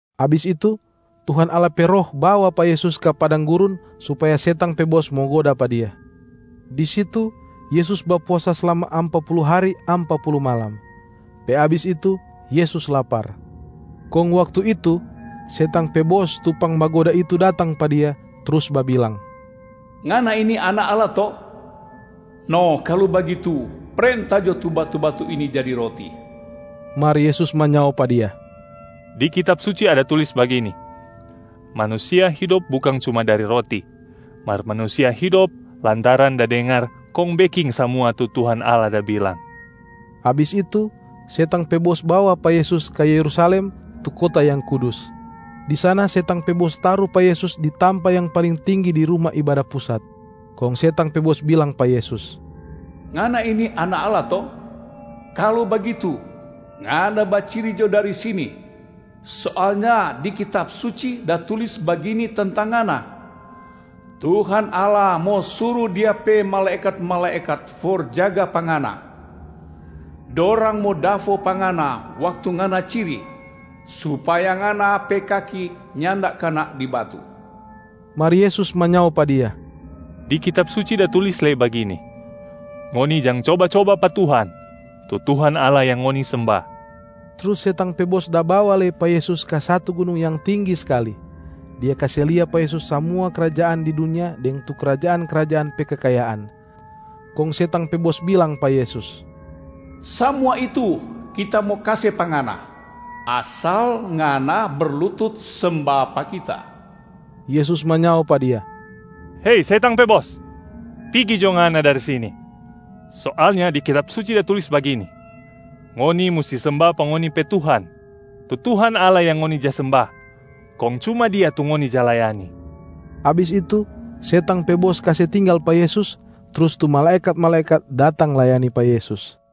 Abis itu, Tuhan Allah pe Roh bawa pa Yesus ka padang gurun supaya setang pe bos mo goda pa Dia. Di situ, Yesus bapuasa slama ampa pulu hari ampa pulu malam. Pe abis itu, Yesus lapar. Kong waktu itu, setang pe bos tu pangbagoda itu datang pa Dia trus babilang, “Ngana ini Anak Allah to? No kalu bagitu, prenta jo tu batu-batu ini jadi roti.” Mar Yesus manyao pa dia, “Di Kitab Suci ada tulis bagini, ‘Manusia hidop bukang cuma dari roti, mar manusia hidop lantaran da dengar kong beking samua tu Tuhan Allah da bilang.’” Abis itu, setang pe bos bawa pa Yesus ka Yerusalem, tu kota yang kudus. Di sana setang pe bos taru pa Yesus di tampa yang paling tinggi di Ruma Ibada Pusat. Kong setang pe bos bilang pa Yesus, “Ngana ini Anak Allah to? Kalu bagitu, Ngana baciri jo dari sini. Soalnya di Kitab Suci da tulis bagini tentang Ngana, ‘Tuhan Allah mo suru Dia pe malaekat-malaekat for jaga pa Ngana. Dorang mo dafo pa Ngana waktu Ngana ciri, supaya Ngana pe kaki nyanda kana di batu.’” Mar Yesus manyao pa dia, “Di Kitab Suci da tulis lei bagini, ‘Ngoni jang coba-coba pa Tuhan, tu Tuhan Allah yang ngoni semba.’” Trus setang pe bos da bawa lei pa Yesus ka satu gunung yang tinggi skali. Dia kase lia pa Yesus samua krajaan di dunia deng tu krajaan-krajaan pe kekayaan. Kong setang pe bos bilang pa Yesus, “Samua itu kita mo kase pa Ngana, asal Ngana berlutut semba pa kita.” Yesus manyao pa Dia, “Hei, setang pe bos, pigi jo ngana dari sini! Soalnya di Kitab Suci da tulis bagini, ‘Ngoni musti semba pa ngoni pe Tuhan, tu Tuhan Allah yang ngoni ja semba, kong cuma Dia tu ngoni ja layani.’” Abis itu, setang pe bos kase tinggal pa Yesus, trus tu malaekat-malaekat datang layani pa Yesus.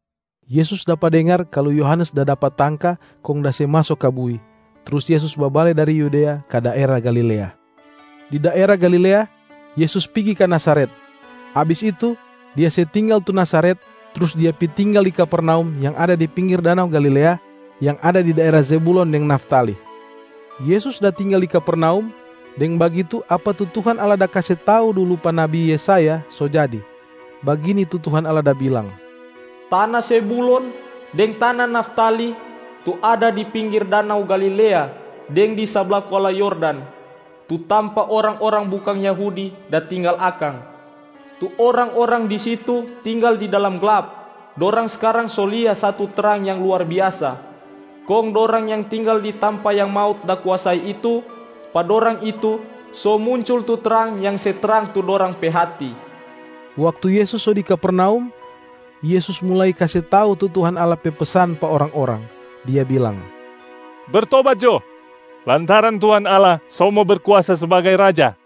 Yesus dapa dengar kalu Yohanes da dapa tangka kong da se maso ka bui, trus Yesus babale dari Yudea ka daera Galilea. Di daera Galilea, Yesus pigi ka Nazaret. Abis itu, Dia se tinggal tu Nazaret, trus Dia pi tinggal di Kapernaum yang ada di pinggir danau Galilea, yang ada di daera Zebulon deng Naftali. Yesus da tinggal di Kapernaum, deng bagitu apa tu Tuhan Allah da kase tau dulu pa nabi Yesaya so jadi. Bagini tu Tuhan Allah da bilang, “Tana Zebulon deng tana Naftali, tu ada di pinggir danau Galilea deng di sabla kuala Yordan, tu tampa orang-orang bukang Yahudi da tinggal akang. Tu orang-orang di situ tinggal di dalam glap, dorang skarang so lia satu trang yang luar biasa. Kong dorang yang tinggal di tampa yang maut da kuasai itu, pa dorang itu so muncul tu trang yang se trang tu dorang pe hati.” Waktu Yesus so di Kapernaum, Yesus mulai kase tau tu Tuhan Allah pe pesan pa orang-orang. Dia bilang, “Bertobat jo, lantaran Tuhan Allah so mo Berkuasa sbagai Raja!”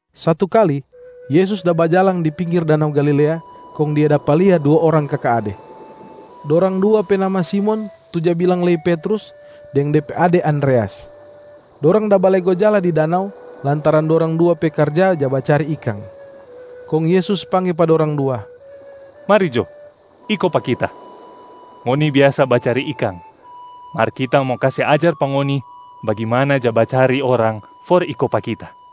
Satu kali, Yesus da bajalang di pinggir danau Galilea, kong Dia dapa lia dua orang kaka ade. Dorang dua pe nama Simon tu ja bilang lei Petrus, deng de pe ade Andreas. Dorang da balego jala di danau, lantaran dorang dua pe karja ja bacari ikang. Kong Yesus pangge pa dorang dua, “Mari jo, iko pa Kita! Ngoni biasa bacari ikang, mar Kita mo kase ajar pa ngoni bagimana ja bacari orang for iko pa Kita.”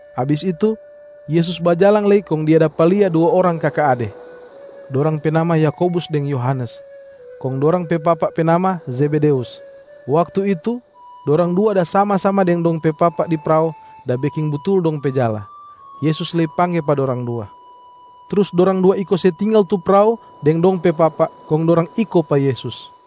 Abis itu, Yesus bajalang lei kong Dia dapa lia dua orang kaka ade. Dorang pe nama Yakobus deng Yohanes, kong dorang pe papa pe nama Zebedeus. Waktu itu, dorang dua da sama-sama deng dong pe papa di prao da beking butul dong pe jala. Yesus lei pangge pa dorang dua. Trus dorang dua iko se tinggal tu prao deng dong pe papa, kong dorang iko pa Yesus.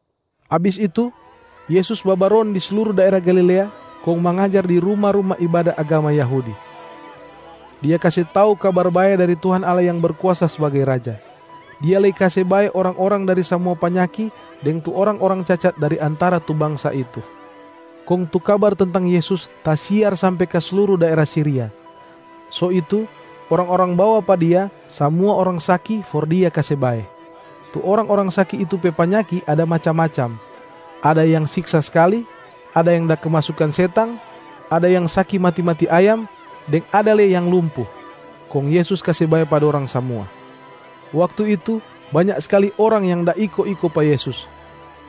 Abis itu, Yesus babaron di sluru daera Galilea kong mangajar di ruma-ruma ibada agama Yahudi. Dia kase tau Kabar Bae dari Tuhan Allah yang Berkuasa sbagai Raja. Dia lei kase bae orang-orang dari samua panyaki deng tu orang-orang cacat dari antara tu bangsa itu. Kong tu kabar tentang Yesus tasiar sampe ka sluru daera Siria. So itu orang-orang bawa pa Dia samua orang saki for Dia kase bae. Tu orang-orang saki itu pe panyaki ada macam-macam: ada yang siksa skali, ada yang da kemasukan setang, ada yang saki mati-mati ayam deng ada lei yang lumpu. Kong Yesus kase bae pa dorang samua. Waktu itu banya skali orang yang da iko-iko pa Yesus.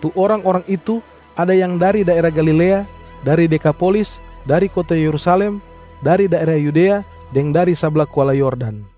Tu orang-orang itu ada yang dari daera Galilea, dari Dekapolisa, dari kota Yerusalem, dari daera Yudea deng dari sabla kuala Yordan.